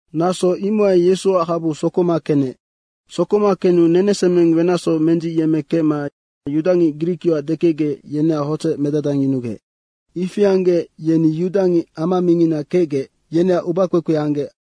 Naso imohai Yesuac habu sokoma kenec. Sokoma kenu nenesemeng wenacsoc mendzicyemmekecma yudangic grikyoac dekecgec, yeneac hodzec medadangyunugec. Ifi anggec, yeni yudangic ama mingina kecgec, yeneac ubakpekpe anggec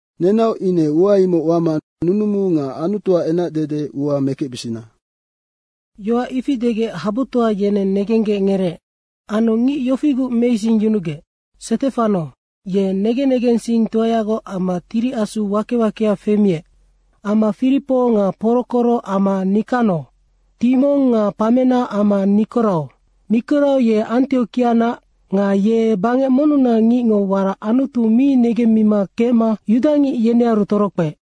Nenaoc ine ua imoc wama nunumu nga Anutuac enacdede ua mekecbisina.” Yoac ifi degec habutoa yeneng negenggec ngereec. Anu ngic yofiguc meisingyunugec: Stefano, ye negen negensingtoayagoc amma Tiri Asu wake wakea femiec, amma Firipo nga Porokoro amma Nikano, Timong nga Pamena amma Nikorao. Nikorao ye Antiokianac nga ye bangec monnunac ngicngo warac Anutu mi negemmima kecma yudangic yenearu torokpeec.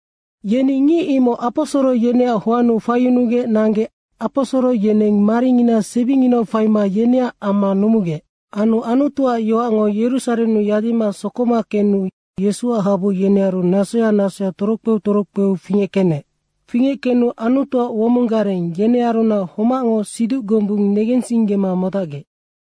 Yeni ngic imoc aposoro yeneac hoannu faiyunugec nanggec aposoro yeneng maringina sebinginau faima yeneac amma numugec. Anu Anutuac yoacngo Yerusarennu yadima sokoma kenu Yesuac habu yenearu nasoya nasoya torokpeu torokpe fingeckenec. Fingeckenu Anutuac womong gareng, yenearunac homacngo siduc gombung negensinggema modacgec.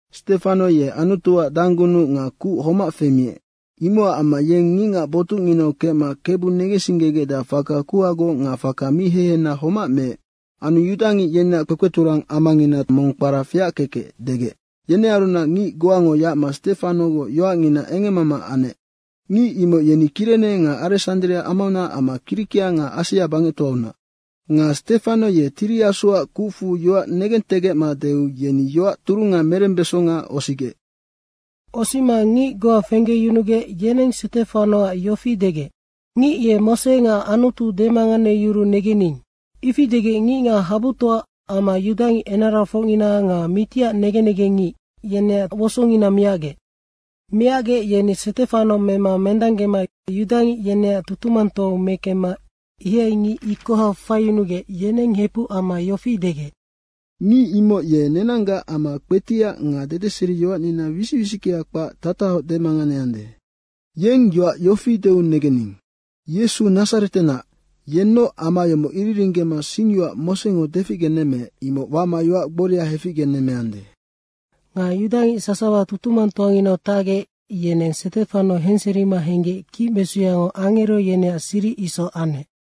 Stefano ye Anutuac danggunuc nga kuc homac femiec. Imocac amma yeng ngicngac botucnginau kecma Kebu negensinggegecdeac faka kuhagoc nga faka mi hehena homac meec. Anu yudangic yeneac kpekpeturang amangina mong kpara Feackekec degec, yenearunac ngic goango yacma Stefanogoc yoacngina engemmama anec. Ngic imoc yeni Kirene nga Aresandria amaunac amma Kirikia nga Asia bangectoaunac. Nga Stefano ye Tiri Asuac kucfu yoac negentegecma deu yeni yoac turunga merembesonga osigec. Osima ngic goa fenggeyunugec, yeneng Stefanoac yofi degec, “Ngic ye Mose nga Anutu demanganeyuruu negening.” Ifi degec ngicngac habutoa amma yudangic enarafocngina nga mitiac negen negengngic, yeneac wosongina miacgec. Miacgec yeni Stefano mema mendanggema yudangic yeneac tutumangtoau mekemma ihai ngic ikoha faiyunugec yeneng hepuc amma yofi degec, “Ngic imoc ye nenanggac ama kpetiac nga dedeseriyoacnina wisic wisickea kpac tatahoc demanganeande.” Yeng yoac yofi deu negening, “Yesu Nadzaretenac, yennoc ama yomoc iriringgema singyoac Mosengo deficgenemmeec, imoc wama yoac gboria heficgenemmeande.” Nga yudangic sasawa tutumangtoanginau tacgec, yeneng Stefano henserima henggec kicmesuyango angero yeneac siric isoc anec.